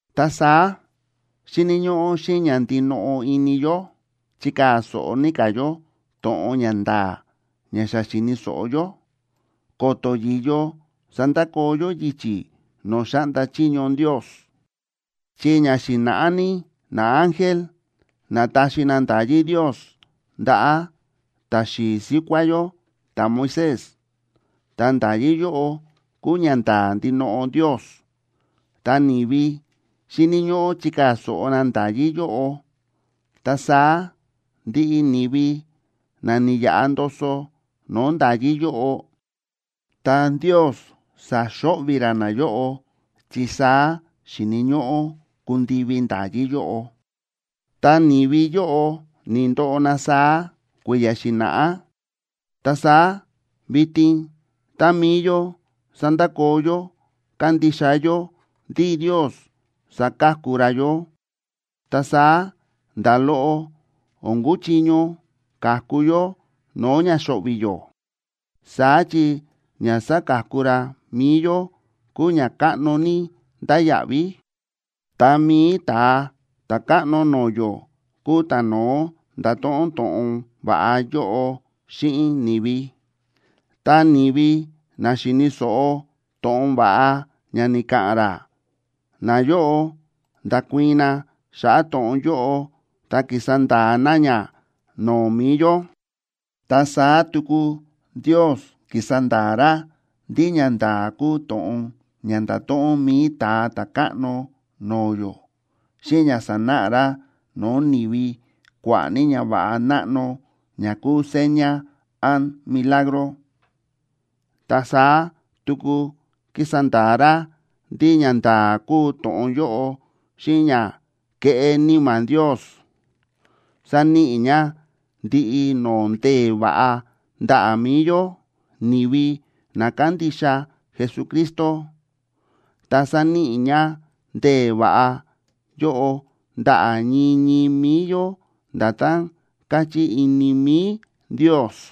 Ta saá xíni̱ ñóꞌó xíꞌin ña ndinoꞌo ini yó chikaa̱ so̱ꞌo ní ka̱ yó to̱ꞌon ña nda̱a̱ ña xa xi̱ni̱ so̱ꞌo yó, ko̱to̱ yi̱yo sandakoo yó yichi̱ no̱o̱ xáꞌnda chiño Ndios. Chi ña xi̱na̱ꞌá ní naángel na̱taxi na nda̱yí Ndios ndaꞌa̱ ta̱xi̱i̱ síkuá yó ta̱Moisés. Ta nda̱yí yóꞌo kúu ñanda̱a̱ ndinoꞌo Ndios, ta ni̱vi xíni̱ ñóꞌó chikaa̱ so̱ꞌo na nda̱yí yóꞌo. Ta saá ndiꞌi ni̱vi na ni̱yaꞌa ndoso no̱o̱ nda̱yí yóꞌo, ta Ndios sa̱xo̱ꞌvi̱ ra nayóꞌo, chi saá xi̱ni̱ ñóꞌó kundivi nda̱yí yóꞌo. Tá ni̱vi yóꞌo ni̱ndoꞌo na saá kui̱ya̱ xi̱na̱ꞌá, ta saá vitin tá mi̱i yó sandakoo yó kándixa yó ndí Ndios saka̱ku ra yó, ta saá nda̱ loꞌo o̱n kuchiño ka̱ku yó no̱o̱ ña xo̱ꞌvi̱ yó. Saá chi ña sáka̱ku ra mi̱i yó kúu ña káꞌno ní ndáya̱ꞌví. Ta mi̱i Ta̱a Ta̱káꞌno no̱o̱ yó kúu ta̱no̱ó nda̱to̱ꞌon to̱ꞌon va̱ꞌa yóꞌo xíꞌin ni̱vi. Ta ni̱vi na xi̱ni̱ so̱ꞌo to̱ꞌon va̱ꞌa ña ni̱ka̱ꞌa̱n ra, nayóꞌo nda̱kuii̱n na xa̱ꞌa̱ to̱ꞌon yóꞌo ta ki̱sa nda̱a̱ na ña no̱o̱ mi̱i yó. Ta saá tuku Ndios ki̱sa nda̱a̱ ra ndí ñanda̱a̱ kúu to̱ꞌon ña nda̱to̱ꞌon mi̱i Ta̱a Ta̱káꞌno no̱o̱ yó, xíꞌin ña sa̱náꞌa ra no̱o̱ ni̱vi kua̱ꞌa̱ ní ñava̱ꞌa náꞌno ña kúu seña án milagro. Ta saá tuku ki̱sa nda̱a̱ ra ndí ñanda̱a̱ kúu to̱ꞌon yóꞌo xíꞌin ña kéꞌé Níma̱ Ndios, sáníꞌi ña ndiꞌi no̱o̱ ndee̱ va̱ꞌa ndaꞌa̱ mi̱i yó, ni̱vi na kándixa Jesucristo, ta sáníꞌi ña ndee̱ va̱ꞌa yóꞌo ndaꞌa̱ ñii ñii mi̱i yó nda̱tán káchí ini mi̱i Ndios.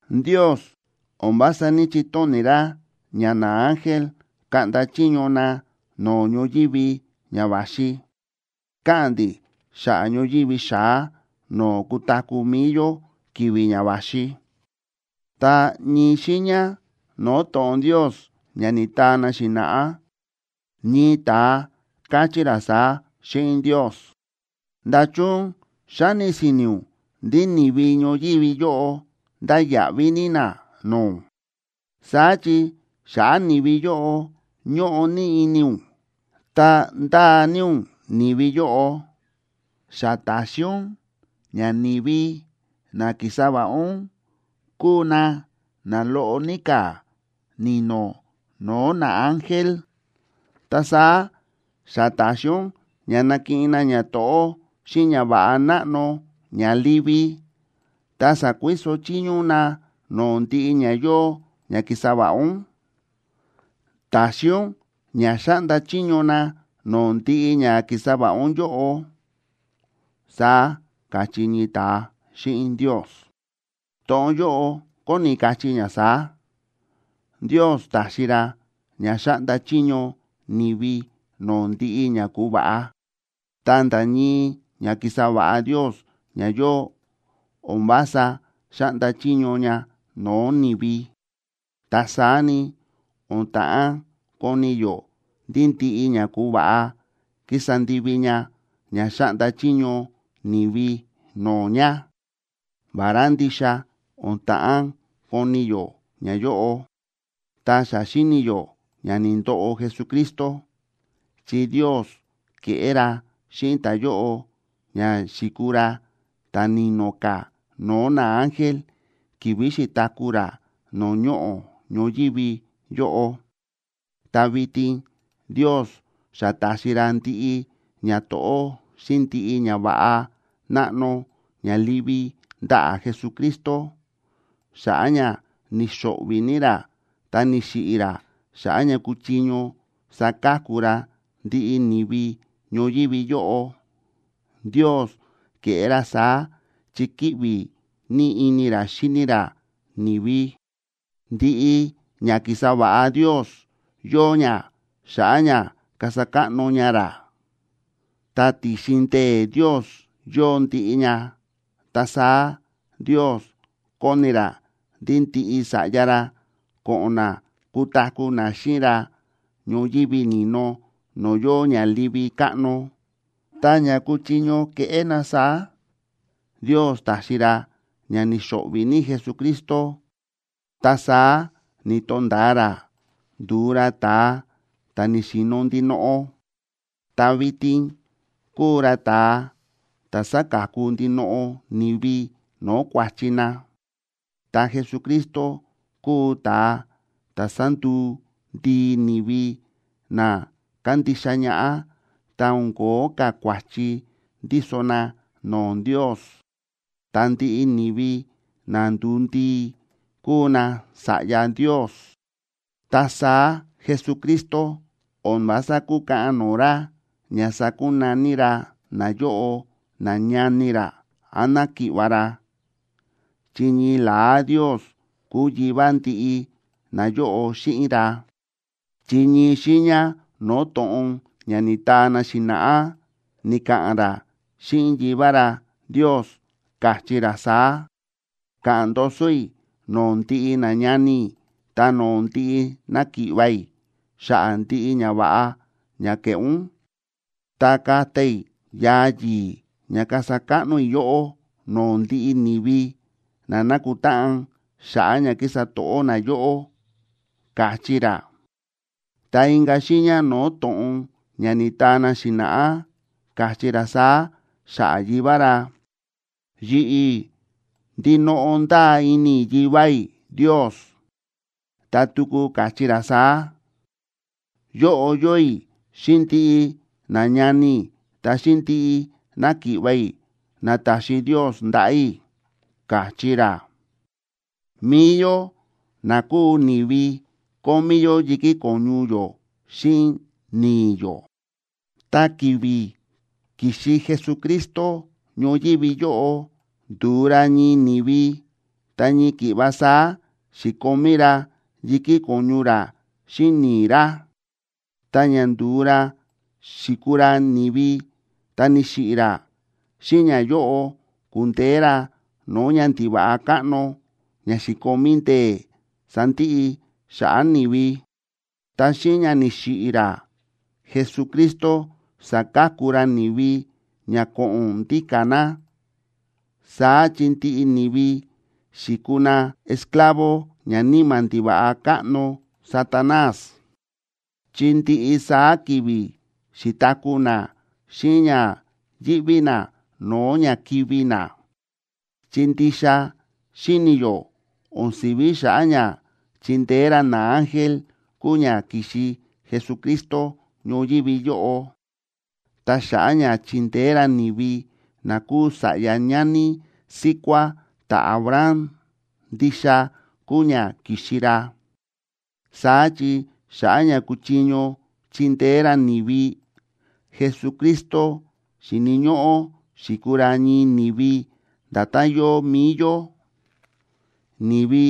Ndios o̱n vása ní‑chitóni̱ ra ña naángel kaꞌnda chiño na no̱o̱ ñoyívi ña va̱xi. Káꞌa̱n ndi̱ xa̱ꞌa̱ ñoyívi xa̱á no̱o̱ kutaku̱ mi̱i yó ki̱vi̱ ña va̱xi. Ta ñii xiiña no̱o̱ to̱ꞌon Ndios ña ni̱taa na xi̱na̱ꞌá, ñii ta̱a káchí ra saá xíꞌin Ndios: ¿Nda̱chun xáni si̱ni̱ ún ndí ni̱vi ñoyívi yóꞌo ndáya̱ꞌví ní na no̱o̱ ún?, saá chi xa̱ꞌa̱ ni̱vi yóꞌo ñóꞌo ní ini ún, ta ndáa ní ún ni̱vi yóꞌo. Xa ta̱xi ún ña ni̱vi na ki̱sa va̱ꞌa ún kúu na na loꞌo ní ka̱ ni̱no̱ no̱o̱ naángel, ta saá xa ta̱xi ún ña nakiꞌin na ñato̱ꞌó xíꞌin ñava̱ꞌa náꞌno ña livi, ta sa̱kuiso chiño ún na no̱o̱ ndiꞌi ña yóo ña ki̱sa va̱ꞌa ún. Ta̱xi ún ña xáꞌnda chiño na no̱o̱ ndiꞌi ña ki̱sa va̱ꞌa ún yóꞌo, saá káchí ñii ta̱a xíꞌin Ndios. To̱ꞌon yóꞌo kóni kachí ña saá: Ndios ta̱xi ra ña xáꞌnda chiño ni̱vi no̱o̱ ndiꞌi ña ku̱va̱ꞌa. Ta nda̱ ñii ña ki̱sa va̱ꞌa Ndios ña yóo, o̱n vása xáꞌnda chiño ña no̱o̱ ni̱vi. Ta saá ni, o̱n ta̱ꞌán koni yó ndí ndiꞌi ña ku̱va̱ꞌa kísa ndivi ña ña xáꞌnda chiño ni̱vi no̱o̱ ña. Vará ndixa o̱n ta̱ꞌán koni yó ñayóꞌo, ta xa xíni yó ña ni̱ndoꞌo Jesucristo, chi Ndios ke̱ꞌé ra xíꞌin ta̱yóꞌo ña xi̱kuu ra ta̱ni̱no̱ ka̱ no̱o̱ naángel ki̱vi̱ xi̱taku̱ ra no̱o̱ ñoꞌo̱ ñoyívi yóꞌo. Ta vitin Ndios xa ta̱xi ra ndiꞌi ñato̱ꞌó xíꞌin ndiꞌi ñava̱ꞌa náꞌno ña livi ndaꞌa̱ Jesucristo, xa̱ꞌa̱ ña ni̱xo̱ꞌvi̱ ní ra ta ni̱xiꞌi̱ ra xa̱ꞌa̱ ña kuchiño saka̱ku ra ndiꞌi ni̱vi ñoyívi yóꞌo. Ndios ke̱ꞌé ra saá chi kíꞌvi ní ini ra xíni ra ni̱vi. Ndiꞌi ña ki̱sa va̱ꞌa Ndios yóo ña xa̱ꞌa̱ ña kasa káꞌno ña ra, ta ti̱xin ndee̱ Ndios yóo ndiꞌi ña. Ta saá Ndios kóni ra ndí ndiꞌi sa̱ꞌya ra ko̱ꞌo̱n na kutaku̱ na xíꞌin ra ñoyívi ni̱no no̱o̱ yóo ña livi káꞌno. Ta ña kuchiño keꞌé na saá, Ndios ta̱xi ra ña ni̱xo̱ꞌvi̱ ní Jesucristo, ta saá ni̱to̱nda̱a ra nduu ra ta̱a ta̱ ni̱xi̱no̱ ndinoꞌo. Ta vitin kúu ra ta̱a ta̱ sáka̱ku ndinoꞌo ni̱vi no̱o̱ kua̱chi na. Ta Jesucristo kúu ta̱a ta̱ sánduu ndii ni̱vi na kándixa ñaꞌá ta o̱n ko̱ó ka̱ kua̱chi ndíso na no̱o̱ Ndios. Ta ndiꞌi ni̱vi na ndu̱u ndii, kúu nasa̱ꞌya Ndios. Ta saá Jesucristo o̱n vása kúkaꞌan no̱o̱ ra ña sakunaní ra nayóꞌo nañani ra án náki̱ꞌva̱ ra, chi ñii la̱á Ndios kúu Yivá ndiꞌi nayóꞌo xíꞌin ra. Chi ñii xiiña no̱o̱ to̱ꞌon ña ni̱taa na xi̱na̱ꞌá, ni̱ka̱ꞌa̱n ra xíꞌin Yivá ra Ndios, káchí ra saá: Ka̱ꞌa̱n ndoso i̱ no̱o̱ ndiꞌi nañani i̱ ta no̱o̱ ndiꞌi náki̱ꞌva̱ i̱, xa̱ꞌa̱ ndiꞌi ñava̱ꞌa ña ke̱ꞌé ún, ta kata i̱ yaa yi̱i̱ ña kasa káꞌno i̱ yóꞌó no̱o̱ ndiꞌi ni̱vi na nákutáꞌan xa̱ꞌa̱ ña kísa to̱ꞌó na yóꞌó, káchí ra. Ta inka̱ xiiña no̱o̱ to̱ꞌon ña ni̱taa na xi̱na̱ꞌá, káchí ra saá xa̱ꞌa̱ Yivá ra: Yi̱ꞌi̱ ndinoꞌo ndáa ini i̱ Yivá i̱ Ndios. Ta tuku káchí ra saá: Yóꞌo yóo i̱ xíꞌin ndiꞌi nañani i̱ ta xíꞌin ndiꞌi náki̱ꞌva̱ i̱, na ta̱xi Ndios ndaꞌa̱ i̱, káchí ra. Mi̱i yó na kúu ni̱vi, kómí yó yi̱kí ko̱ñu yó xíꞌin ni̱i̱ yó. Ta ki̱vi̱ ki̱xi Jesucristo ñoyívi yóꞌo ndu̱u ra ñii ni̱vi, ta ñii ki̱ꞌva saá xi̱komí ra yi̱kí ko̱ñu ra xíꞌin ni̱i̱ ra. Ta ña ndu̱u ra xi̱kuu ra ni̱vi ta ni̱xiꞌi̱ ra, xíꞌin ñayóꞌo ku̱ndeé ra no̱o̱ ñandiva̱ꞌa káꞌno ña xi̱komí ndee̱ sandiꞌi xa̱ꞌa̱ ni̱vi. Ta xíꞌin ña ni̱xiꞌi̱ ra, Jesucristo sa̱ka̱ku ra ni̱vi ña ko̱ꞌo̱n ndíka̱ na. Saá chi ndiꞌi ni̱vi xi̱kuu na esclavo ñaníma̱ ndiva̱ꞌa káꞌno Satanás, chi ndiꞌi saá ki̱vi̱ xi̱taku̱ na xíꞌin ña yíꞌví na no̱o̱ ña kivi̱ na. Chi ndixa xíni̱ yó, o̱n si̱ví xa̱ꞌa̱ ña chindeé ra naángel kúu ña ki̱xi Jesucristo ñoyívi yóꞌo, ta xa̱ꞌa̱ ña chindeé ra ni̱vi na kúu sa̱ꞌya ñani síkuá ta̱Abraham, ndixa kúu ña ki̱xi ra. Saá chi xa̱ꞌa̱ ña kuchiño chindeé ra ni̱vi, Jesucristo xi̱ni̱ ñóꞌó xi̱kuu ra ñii ni̱vi nda̱tán yóo mi̱i yó, ni̱vi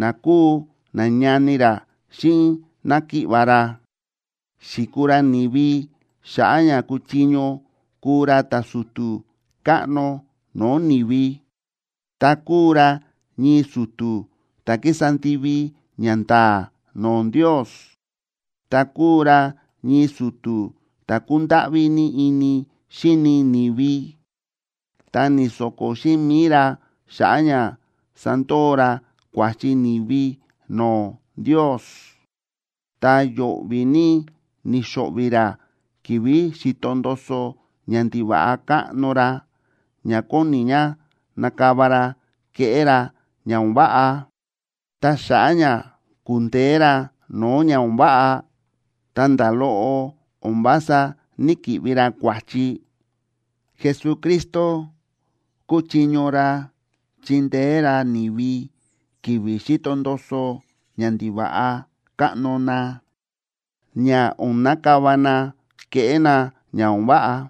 na kúu nañani ra xíꞌin náki̱ꞌva̱ ra. Xi̱kuu ra ni̱vi xa̱ꞌa̱ ña kuchiño kúu ra ta̱su̱tu̱ káꞌno no̱o̱ ni̱vi. Ta kúu ra ñii su̱tu̱ ta̱ kísa ndivi ñanda̱a̱ no̱o̱ Ndios, ta kúu ra ñii su̱tu̱ ta̱ kúndáꞌví ní ini xíni ni̱vi, ta ni̱so̱ko̱ xíꞌin mi̱i ra xa̱ꞌa̱ ña sandoo ra kua̱chi ni̱vi no̱o̱ Ndios. Ta yo̱ꞌvi̱ ní ni̱xo̱ꞌvi̱ ra ki̱vi̱ xi̱to ndoso ñandiva̱ꞌa káꞌno ra ña kóni ña nakava ra keꞌé ra ña o̱n váꞌa. Ta xa̱ꞌa̱ ña ku̱ndeé ra no̱o̱ ña o̱n váꞌa, ta nda̱ loꞌo o̱n vása ní‑kiꞌvi ra kua̱chi, Jesucristo kúchiño ra chindeé ra ni̱vi ki̱vi̱ xíto ndoso ñandiva̱ꞌa káꞌno na, ña o̱n nakava na keꞌé na ña o̱n váꞌa.